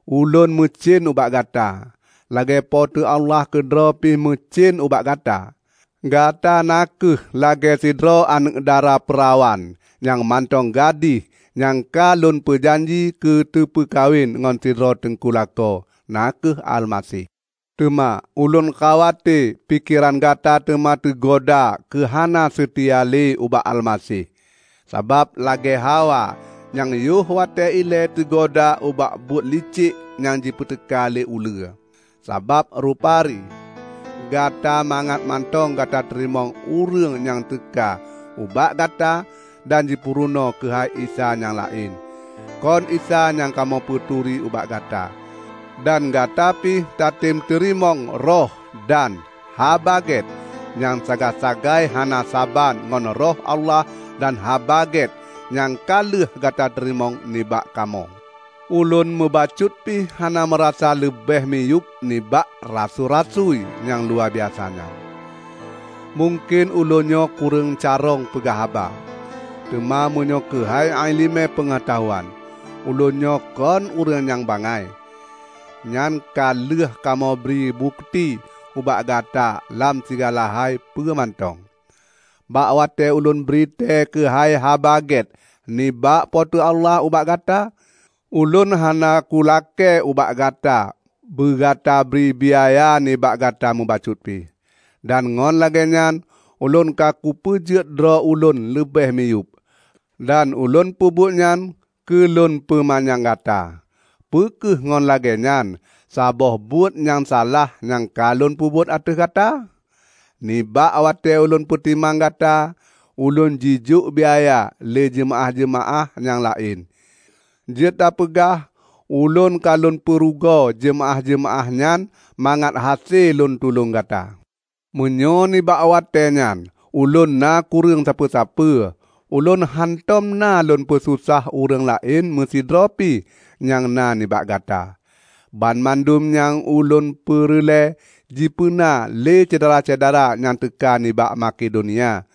Ulôn meucen ubak gata, lagée Po teu Allah keudroe pi meucen ubak gata. Gata na kheueh lagée sidroe aneuëk dara peurawan nyang mantong gadih nyang ka lôn peujanji keu teupeukawen ngon sidroe teungku lakoe, na kheueh Almaseh. Teuma ulôn khawate pikeran gata teuma teugoda keu hana seutia lé ubak Almaseh, saban lagée Hawa nyang yoh watée ilée teugoda ubak buet licek nyang jipeuteuka lé uleue. Sabab rupari gata magat mantong gata teurimong ureuëng nyang teuka ubak gata dan jipeurunoe keuhai Isa nyang laén -- kon Isa nyang kamoe peuturi ubak gata. Dan gata pi tatem teurimong roh dan "haba gét" nyang sagai-sagai hana saban ngon Roh Allah dan Haba Gét nyang ka lheueh gata teurimong nibak kamoe. Ulôn meubacut pi hana meurasa leubeh miyueb nibak "rasui-rasui" nyang luwabiasa nyan! Mungken ulôn nyoe kureueng carông peugah haba, teuma meunyoe keuhai iéleumé peungeutahuan, ulôn nyoe kon ureuëng nyang bangai. Nyan ka lheueh kamoe bri bukeuti ubak gata lam sigala hai peue mantong. Bak watée ulôn britée keuhai Haba Gét nibak Po teu Allah ubak gata, ulôn hana kulakée ubak gata beugata bri biaya nibak gata meubacut pi; dan ngon lagée nyan ulôn ka kupeujeuet droe ulôn leubeh miyueb. Dan ulôn peubuet nyan keulôn peumanyang gata. Peu kheueh ngon lagée nyan saboh buet nyang salah nyang ka lôn peubuet ateueh gata? Nibak watée ulôn peutimang gata, ulôn jijok biaya lé jeumaáh-jeumaáh nyang laén. Jeuet tapeugah ulôn ka lôn peurugoe jeumaáh-jeumaáh nyan mangat hase lôn tulông gata. Meunyoe nibak watée nyan ulôn na kureueng sapeue-sapeue, ulôn hántom na lôn peususah ureuëng laén meusidroe pi nyang na nibak gata. Banmandum nyang ulôn peureulée jipeuna lé syedara-syedara nyang teuka nibak Makedonia.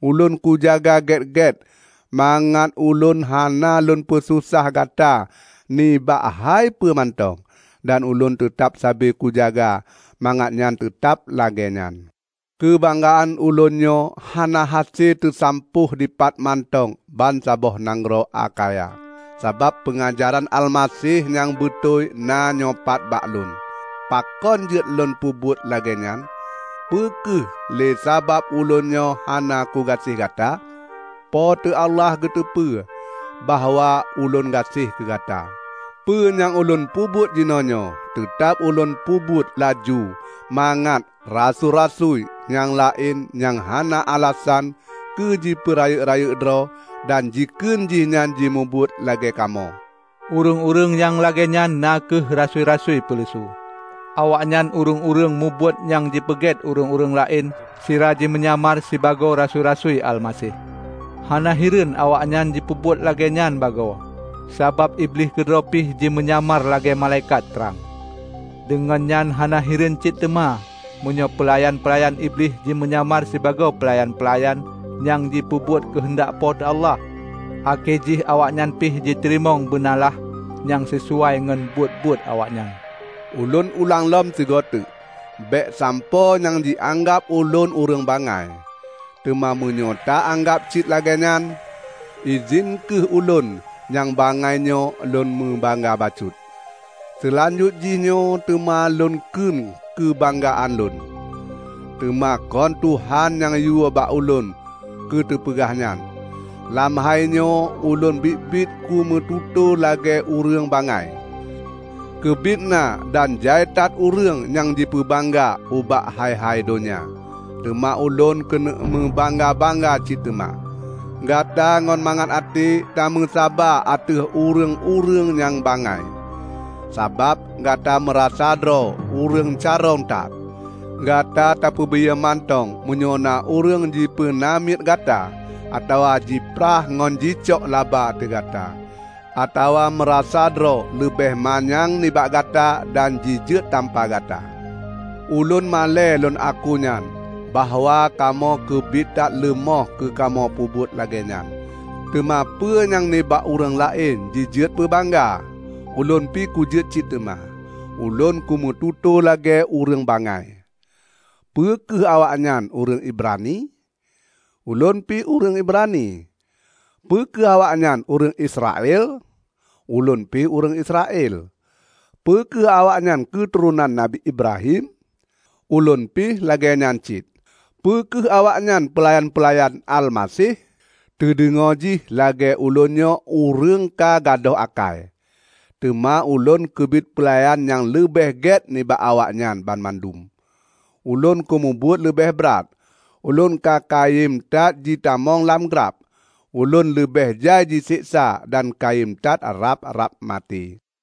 Ulôn kujaga gét-gét mangat ulôn hana lôn peususah gata nibak hai peue mantong, dan ulôn teutab sabe kujaga mangat nyan teutab lagée nyan. Keubanggaan ulôn nyoe hana hase teusampôh dipat mantong bansaboh nanggroe Akhaya, sabab peungajaran Almaseh nyang beutôi na nyoepat bak lôn. Pakon jeuet lôn peubuet lagée nyan? Peu kheueh lé sabab ulôn nyoe hana kugaséh gata? Po teu Allah geuteupeue bahwa ulôn gaséh keu gata! Peue nyang ulôn peubuet jinoenyoe teutab ulôn peubuet laju mangat "rasui-rasui" nyang laén nyang hana alasan keu jipeurayeuk-rayeuk droe dan jikheun jihnyan jimubuet lagée kamoe. Ureuëng-ureuëng nyang lagée nyan na kheueh rasui-rasui peuleusu. Awaknyan ureuëng-ureuëng mubuet nyang jipeunget ureuëng laén sira jimeunyamar sibagoe rasui-rasui Almaseh. Hana hireuen awaknyan jipeubuet lagée nyan bagoe, sabab Iblih keudroe pi jimeunyamar lagée malaikat trang! Deungon nyan hana hireuen cit teuma meunyoe peulayan-peulayan Iblih jimeunyamar sibagoe peulayan-peulayan nyang jipeubuet keuheundak Po teu Allah. Akhé jih awaknyan pi jiteurimong beunalaih nyang sisuai ngon buet-buet awaknyan. Ulôn ulang lom sigoe teuk: Bék sampoe nyang jianggab ulôn ureuëng bangai. Teuma meunyoe ta-anggab cit lagée nyan, idhin kheueh ulôn nyang bangai nyoe lôn meubangga bacut. Seulanjut jihnyoe teuma lôn kheun keubanggaan lôn, teuma kon Tuhan nyang yue bak ulôn keuteupeugah nyan. Lam hainyoe ulôn biet-biet kumeututoe lagée ureuëng bangai. Keubiet na dan jai that ureuëng nyang jipeubangga ubak hai-hai donya, teuma ulôn keuneuk meubangga-bangga cit teuma. Gata ngon mangat até tameusaba ateueh ureuëng-ureuëng nyang bangai, sabab gata meurasa droe ureuëng carông that! Gata tapeubiyeu mantong meunyoe na ureuëng jipeunamiet gata, atawa jiprah ngon jicok laba ateueh gata, atawa meurasa droe leubeh manyang nibak gata dan jijeuet tampa gata. Ulôn malée lôn akunyan bahwa kamoe keubiet that leumoh keukamoe peubuet lagée nyan. Teuma peue nyang nibak ureuëng laén jijeuet peubangga, ulôn pi kujeuet cit teuma! (Ulôn kumeututoe lagée ureuëng bangai). Peu kheueh awaknyan ureuëng Ibrani? Ulôn pi ureuëng Ibrani. Peu kheueh awaknyan ureuëng Israel? Ulôn pi ureuëng Israel. Peu kheueh awaknyan keuturonan Nabi Ibrahim? Ulôn pi lagée nyan cit! Peu kheueh awaknyan peulayan-peulayan Almaseh? Teudeungoe jih lagée ulôn nyoe ureuëng ka gadôh akai, teuma ulôn keubiet peulayan nyang leubeh gét nibak awaknyan banmandum! Ulôn kumubuet leubeh brat, ulôn ka kayém that jipeutamong lam glab, ulôn leubeh jai jiseksa dan kayém that rab-rab maté.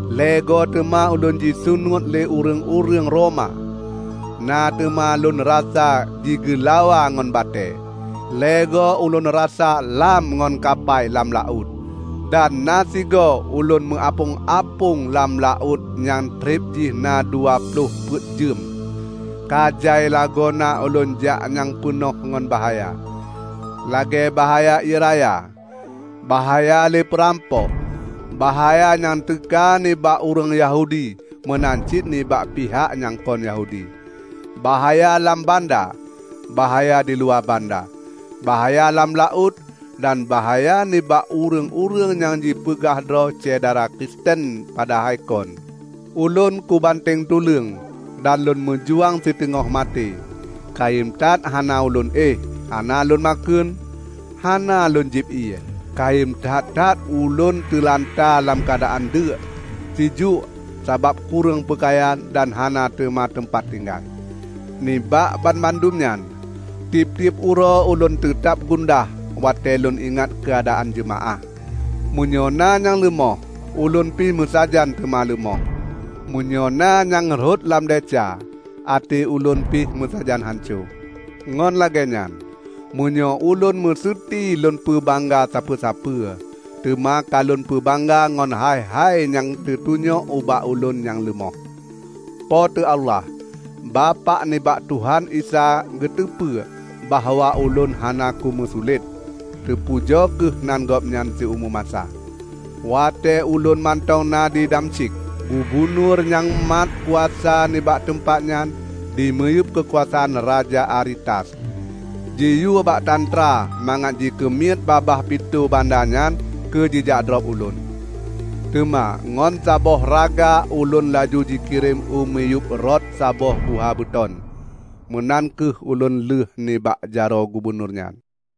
Lhée goe teuma ulôn jisunuet lé ureuëng-ureuëng Roma; na teuma lôn rasa jigeulawa ngon batée. Lhée goe ulôn rasa lham ngon kapai lam laôt, dan na sigoe ulôn meuapöng-apöng lam laôt nyang treb jih na dua ploh peuet jeuem. Ka jai lagoe na ulôn jak nyang peunoh ngon bahaya: lagée bahaya ié raya, bahaya lé peurampok, bahaya nyang teuka nibak ureuëng Yahudi meunan cit nibak pihak nyang kon Yahudi, bahaya lam banda, bahaya diluwa banda, bahaya lam laôt dan bahaya nibak ureuëng-ureuëng nyang jipeugah droe syedara Kristen padahai kon. Ulôn kubanteng tuleueng dan lôn meujuang siteungoh maté: kayém that hana ulôn éh, hana lôn makheun, hana lôn jieb ié, kayém that-that ulôn teulanta lam keuadaan deuk, sijuek sabab kureueng peukayan dan hana teuma teumpat tinggai. Nibak banmandum nyan, tieb-tieb uroe ulôn teutab gundah watée lôn ingat keuadaan jeumaáh. Meunyoe na nyang leumoh ulôn pih meusajan teuma leumoh. Meunyoe na nyang rhot lam desya, até ulôn pi meusajan hanco. Ngon lagéenyan, meunyoe ulôn meuseuti lôn peubangga sapeue-sapeue, teuma ka lôn peubangga ngon hai-hai nyang teutunyok ubak ulôn nyang leumoh. Po teu Allah, Bapak nibak Tuhan Isa geuteupeue bahwa ulôn hana kumeusulet. Teupujoe kheueh nan Gobnyan siumu masa. Watée ulôn mantong na di Damsyik, gubunur nyang mat kuasa nibak teumpat nyan dimiyueb keukuasaan Raja Aretas, jiyue bak tantra mangat jikeumiet babah pintoe banda nyan keujijak drob ulôn. Teuma ngon saboh raga ulôn laju jikirém u miyueb rot saboh guha beuton. Meunan kheueh ulôn lheueh nibak jaroe gubunur nyan.